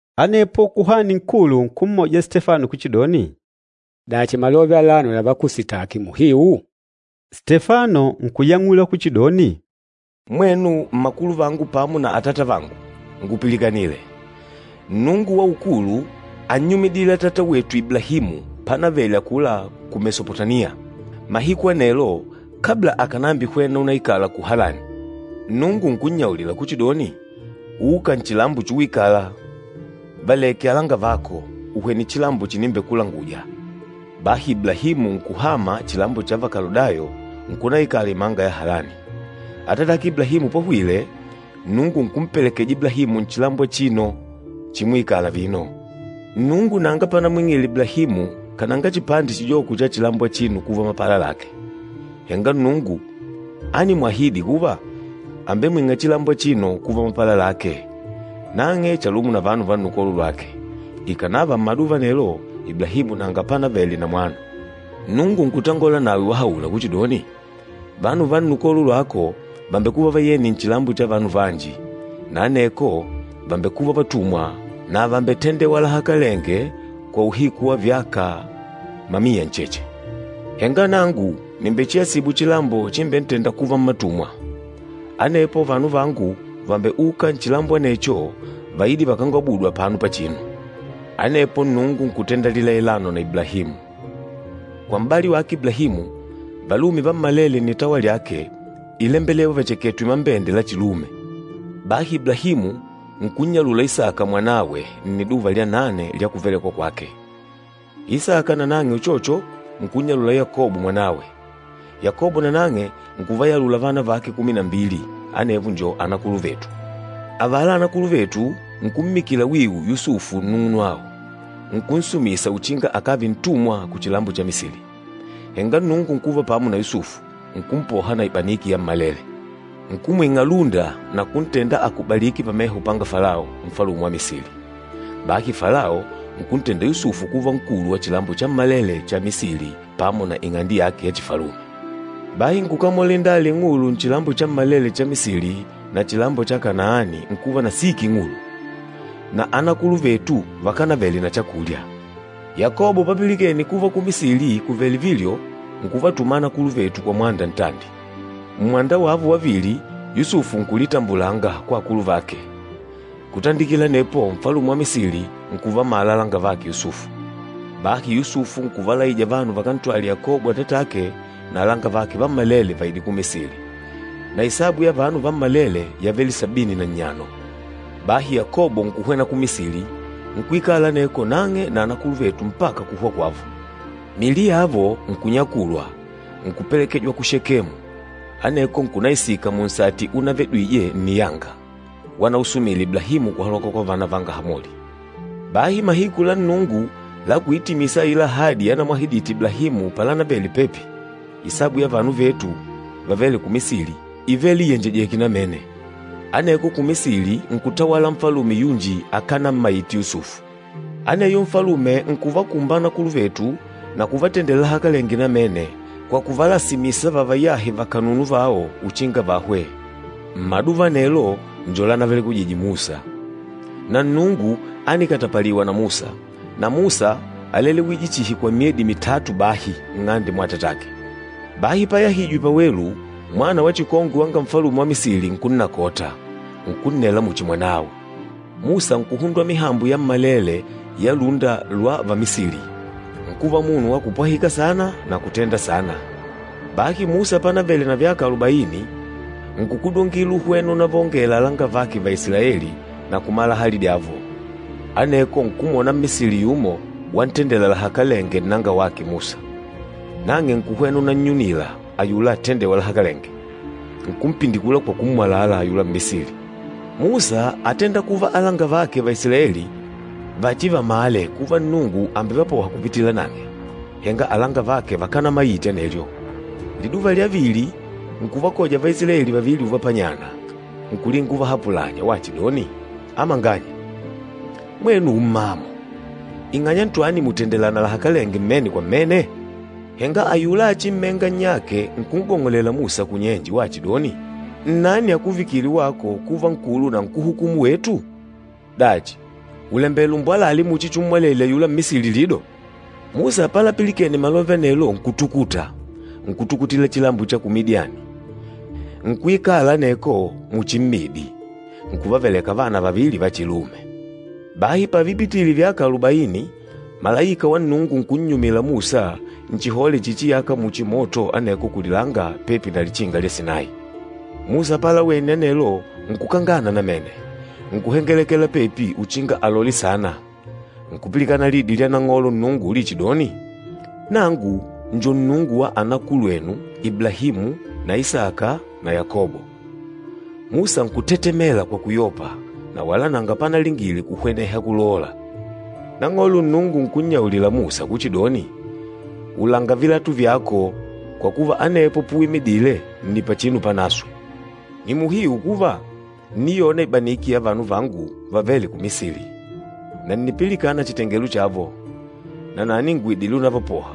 Anepo Kuhani Nkulu nkummuja Stefano kuchidoni, “Dachi malove alano lavakusitaki muhiu?” Stefano nkuyang'ula kuchidoni, “Mwenu mmakuluvangu pamo na atatavangu, ngupilikanile! Nnungu wa ukulu ánnyumidile atata wetu Iblahimu panavele akula ku Mesopotamiya mahiku anelo kabla akànambihwena unaikala ku Halani. Nnungu nkunyaulila kuchidoni, ‘Uka nchilambo chuwikala, valeke alangavako, uhwene chilambo chinimbekulanguja.’ Bahi Iblahimu nkuhama chilambo cha va Kaludayo nkunaikala imanga ya Halani. Atatake Iblahimu pahwile, Nnungu nkumpelekeja Iblahimu nchilambo achino chimuikala vino. Nnungu nanga panamwing'ile Iblahimu kananga chipande chijoko cha chilambo achino kuva mapala lake. Henga Nnungu ánimwahidi kuva àmbemwing'a chilambo achino kuva mapala lake, nang'e chalumo na vanu va nnukolo lwake, ikànava mmaduva anelo Iblahimu nanga panavele na mwana. Nnungu nkutangola nawe wahaula kuchidoni, ‘Vanu va nnukolo lwako vàmbekuva vayeni nchilambo cha vanu vanji na aneko vàmbekuva vatumwa na vàmbetendewa lahakalenge kwa uhiku wa vyaka mamiya ncheche. Henga nangu nìmbechiasibu chilambo chimbentênda kuva mmatumwa. Anepo vanu vangu vàmbeuka nchilambo anecho vaide vakangwabudu apano pachinu.’ Anepo Nnungu nkutenda lilailano na Iblahimu. Kwa m'bali wake Iblahimu, valume vammalele nnitawa lyake ílembelewa vacheketwe mambende la chilume. Bahi Iblahimu nkunnyalula Isaka mwanawe nniduva lya nane lya kuvelekwa kwake. Isaka nanang'e uchocho nkunnyalula Yakobo mwanawe. Yakobo nanang'e nkuvayalula vana vake kumi na mbili, anevo njo anakuluvetu. Avala anakuluvetu nkummikila wiwu Yusufu nnung'unwao, nkunsumisa uchinga akave ntumwa kuchilambo cha Misili. Henga Nnungu nkuva pamo na Yusufu, nkumpoha na ibaniki yammalele. Nkumwing'a lúnda na kuntenda akubalike pameho panga Falao, Nfalume wa Misili. Bahi Falao nkuntenda Yusufu kuva nkulu wa chilambo chammalele cha Misili pamo na ing'ande yake ya chifalume. Bahi nkukamola indala ing'ulu nchilambo chammalele cha Misili na chilambo cha Kanaani, nkuva na siki ing'ulu. Na anakuluvetu vakanavele na chakulya. Yakobo papilikene kuva ku Misili kùvele vilyo, nkuvatuma anakuluvetu kwa mwanda ntandi. Mmwanda wavo wavili Yusufu nkulitambulanga kwa akuluvake, kutandikila anepo Nfalume wa Misili nkuvamala alangavake Yusufu. Bahi Yusufu nkuvalaija vanu vakantwale Yakobo atatake na alangavake vammalele vaide ku Misili. Na isabu ya vanu vammalele yavele sabini na nnyano. Bahi Yakobo nkuhwena ku Misili, nkuikala aneko nang'e na anakuluvetu mpaka kuhwa kwavo. Miili yavo nkunyakulwa, nkupelekejwa ku Shekemu, aneko nkunaisika munsati unavedwije nniyanga, wanausumile Iblahimu kuhaloka kwa vana vanga Hamoli. Bahi mahiku la Nnungu la kuitimisa aila ahadi yanamwahidite Iblahimu palanavele pepi, isabu ya vanu vetu vavêle ku Misili ívele iyenjejèkè namene. Aneko ku Misili nkutawala Nfalume yunji akanammaite Yusufu. Aneyo Nfalume nkuvakumba anakuluvetu na kuvatendela lahakalenge namene kwa kuvalasimisa vavayahe vakanunu vao uchinga vahwe. Mmaduva anelo njo lanavelekwije Musa. Na Nnungu ánikatapaliwa na Musa, na Musa álelewije chihi kwa myedi mitatu bahi nng'ande mwa atatake. Bahi payahijwe pawelu, mwana wa chikongwe wanga Nfalume wa Misili nkunnakota, nkunnela muchi mwanawe. Musa nkuhundwa mihambo yammalele ya lúnda lwa va Misili, nkuva munu wa kupwahika saana na kutenda saana. Bahi Musa panavele na vyaka alubaini, nkukudungila uhwene unavaongela alangavake Vaisilaeli na kumala hali dyavo. Aneko nkumwona Mmisili yumo wantendela lahakalenge nnangawake Musa, nang'e nkuhwena unannyunila ayula atendêwa lahakalenge, nkumpindikula kwa kummwalala ayula Mmisili. Musa átenda kuva alangavake Vaisilaeli vachivamale kuva Nnungu àmbevapoha kupitila nang'e, henga alangavake vakanamaite anelyo. Liduva lya vili nkuvakoja Vaisilaeli vavili uvapanyana, nkulinga kuvahapulanya wachidoni, ‘Amanganya, mwenu ummamo. Ing'anya ntwani mùtendelana lahakalenge mmene kwa mmene?’ Henga ayula achimmenga nnyake nkun'gong'olela Musa kunnyenje wachidoni, ‘Nnani akuvikile wako kuva nkulu na nkuhukumu wetu? Dachi, ùlembela umbwalale muchi chummwalele ayula Mmisili lido?’ Musa palapilikene malove anelo nkutukuta, nkutukutila chilambo cha ku Midiani, nkuikala aneko muchi mmidi, nkuvaveleka vana vavili vachilume. Bahi pavipitile vyaka alubaini, malaika wa Nnungu nkunnyumila Musa nchihole chichiyaka muchi moto aneko kulilanga pepi na Lichinga lya Sinayi. Musa palawene anelo nkukangana namene, nkuhengelekela pepi uchinga alole saana, nkupilikana lidi lya Nang'olo Nnungu ulichidoni, ‘Nangu njo Nnungu wa anakulwenu Iblahimu na Isaka na Yakobo!’ Musa nkutetemela kwa kuyopa na wala nanga panalingile kuhweneha kulola. Nang'olo Nnungu nkunnyaulila Musa kuchidoni, ‘Ulanga vilatu vyako kwa kuva anepo puwimidile nni pachinu panaswe. Nni muhiu kuva, ǹniyona ibaniki ya vanu vangu vavêle ku Misili. Na ǹnipilikana chitengelo chavo, nanani ngùidile unavapoha.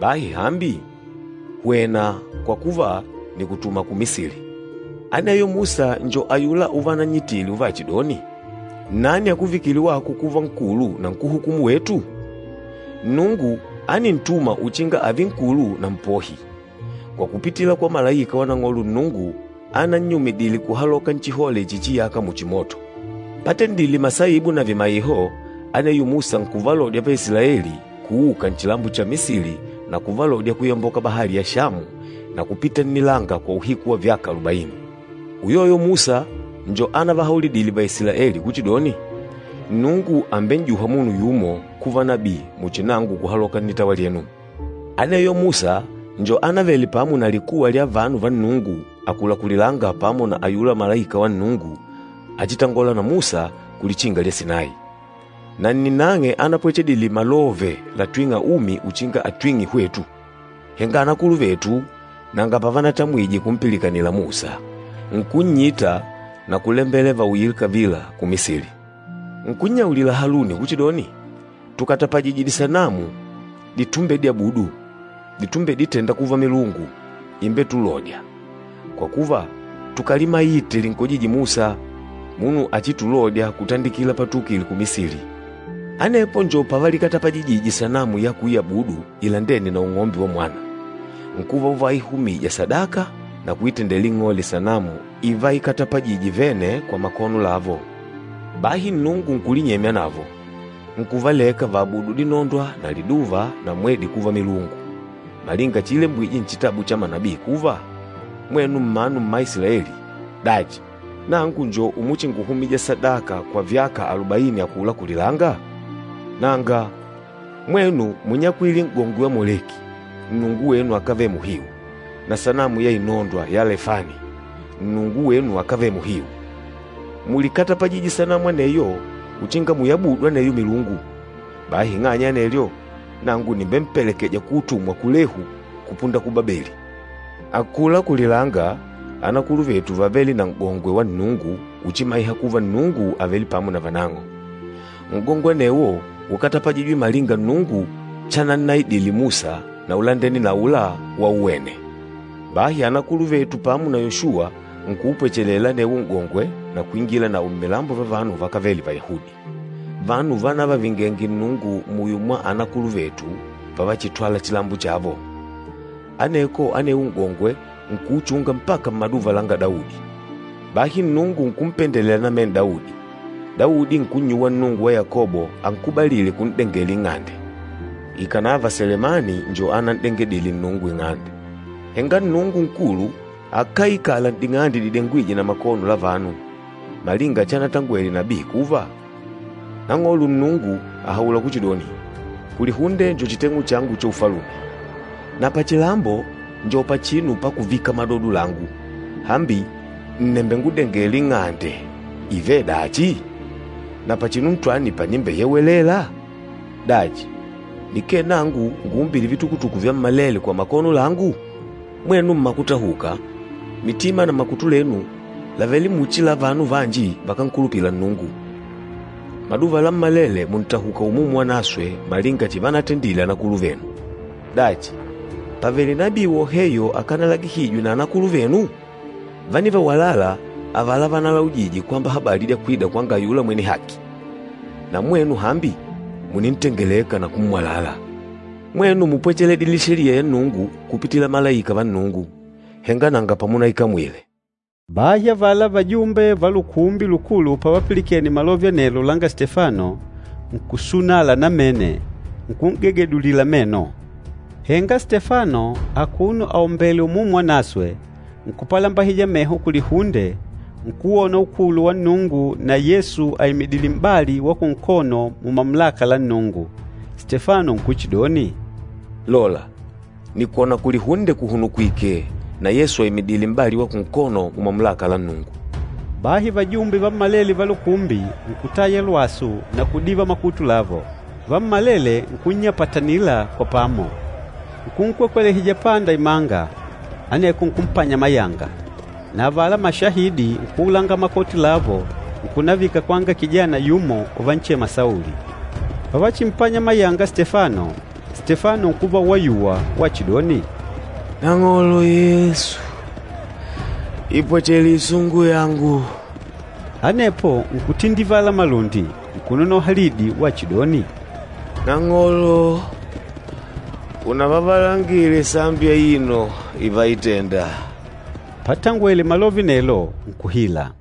Bahi hambi, hwena kwa kuva nikutuma ku Misili.’ Aneyo Musa njo ayula uvanannyitile uvachidoni, ‘Nnani akuvikile wako kuva nkulu na nkuhukumu wetu?’ Nnungu ánintuma uchinga ave nkulu na mpohi, kwa kupitila kwa malaika wa Nang'olo Nnungu anannyumidile kuhaloka nchihole chichiyaka muchi moto. Patendile masaibu na vimaiho, aneyo Musa nkuvalodya Vaisilaeli kuuka nchilambo cha Misili na kuvalodya kuyamboka Bahali ya Shamu na kupita nnilanga kwa uhiku wa vyaka alubaini. Uyoyo Musa njo anavahaulidile Vaisilaeli kuchidoni, ‘Nnungu àmben'juha munu yumo kuva nabii muchi nangu kuhaloka nnitawa lyenu.’ Aneyo Musa njo anavele pamo na likuwa lya vanu va Nnungu akula kulilanga pamo na ayula malaika wa Nnungu achitangôla na Musa ku Lichinga lya Sinayi. Na nni nang'e anapwechedile malove latwîng'a umi uchinga atwing'e hwetu. Henga anakuluvetu nanga pavanatamwije kumpilikanila Musa, nkunnyita na kulembela vauyile kavila ku Misili. Nkunnyaulila Haluni kuchidoni, ‘Tukatapajije disanamu ditumbedyabudu, ditumbeditenda kuva milungu imbetulôdya, kwa kuva tukalimaite linkojîje Musa, munu achitulodya kutandikila patuukile ku Misili!’ Anepo njo pavalikatapajijije sanamu ya kuyabudu ilandêne na ung'ombe wa mwana, nkuva uvaihumija sadaka na kuitendela ing'ole sanamu ivaikatapajije vene kwa makono lavo. Bahi Nnungu nkulinyemya navo, nkuvaleka vaabudu dinondwa na liduva na mwedi kuva milungu, malinga chiilembwije nchitabu cha manabii kuva, ‘Mwenu mmanu mma Isilaeli, dachi, nangu njo umuchinguhumija sadaka kwa vyaka alubaini akula kulilanga? Nanga, mwenu múnyakwile n'gongwe wa Moleki, nnungu wenu akave muhiu, na sanamu ya inondwa ya Lefani, nnungu wenu akave muhiu. Múlikatapajije sanamu aneyo uchinga muyabudu aneyo milungu. Bahi ing'anya ya anelyo, nangu nìmbempelekeja kuutumwa kulehu, kupunda ku Babeli.’ Akula kulilanga anakuluvetu vávele na N'gongwe wa Nnungu uchimaiha kuva Nnungu àvele pamo na vanang'o. N'gongwe anewo ukatapajijwe malinga Nnungu chanannaidile Musa na ulandene na aula wauwene. Bahi anakuluvetu pamo na Yoshuwa nkuupwechelela anewo N'gongwe na kuingila nawo mmilambo vya vanu vakávele Vayahudi, vanu vanavavingenge Nnungu muyo mwa anakuluvetu pavachitwala chilambo chavo. Aneko, anewo N'gongwe nkuuchunga mpaka mmaduva langa Daudi. Bahi Nnungu nkumpendelela namene Daudi, Daudi nkunnyuwa Nnungu wa Yakobo ankubalile kun'dengela Ing'ande. Ikànava Selemani njo anan'dengedile Nnungu Ing'ande. Henga Nnungu Nkulu akáikala n'ding'ande didengwîje na makono la vanu, malinga chanatangwele nabii kuva, ‘Nang'olo Nnungu àhaula kuchidoni, “Kulihunde njo chiteng'u changu cha Ufalume, na pachilambo njo pachinu pakuvika madodo langu. Hambi ǹnembengudengela ing'ande ivedachi? Na pachinu ntwani panimbeyewelela? Dachi, nikee nangu nguumbîle vitukutuku vyammalele kwa makono langu?” ’ Mwenu mmakutahuka, mitima na makutu lenu làvele muchi la vanu vanji vakánkulupila Nnungu. Maduva lammalele mùntahuka Umumu Wanaswe malinga chivanatendile anakuluvenu. Dachi, pàvele nabii woheyo akanalagihijwe na anakuluvenu? Vánivawalala avala vanalaujije kwamba habali ya kwida kwanga ayula Mwene Haki. Na mwenu hambi mùnintengeleka na kummwalala. Mwenu múpwechedile Sheliya ya Nnungu kupitila malaika va Nnungu, henga nanga pamunaikamwile!” Bahi avala vajumbe va Lukumbi Lukulu pavapilikene malove anelo langa Stefano, nkusunala namene, nkun'gegedulila meno. Henga Stefano akuno aombèlè Umumu Wanaswe, nkupalambahija meho kulihunde, nkuwona ukulu wa Nnungu na Yesu aimidìlè m'bali wa kunkono mumamulaka la Nnungu. Stefano nkuchidoni, “Lola, nìkwona kulihunde kuhunukwike na Yesu aimidìlè m'bali wa kunkono mumamulaka la Nnungu.” Bahi vajumbe vammalele va lukumbi nkutaya lwasu na kudiva makutu lavo. Vammalele nkunnyapatanila kwa pamo. Nkunkwekwelehija panda imanga, aneko nkumpanya mayanga. Na avala mashahidi nkuulanga makoti lavo nkunavika kwanga kijana yumo uvanchema Sauli. Pavachimpanya mayanga Stefano, Stefano nkuva wayuwa wachidoni, “Nang'olo Yesu, ipwachele isungu yangu.” Anepo nkutindivala malundi, nkunonoha lidi wachidoni, “Nang'olo, unavavalangile sambi aino ivaitenda.” Patangwele malove anelo nkuhila.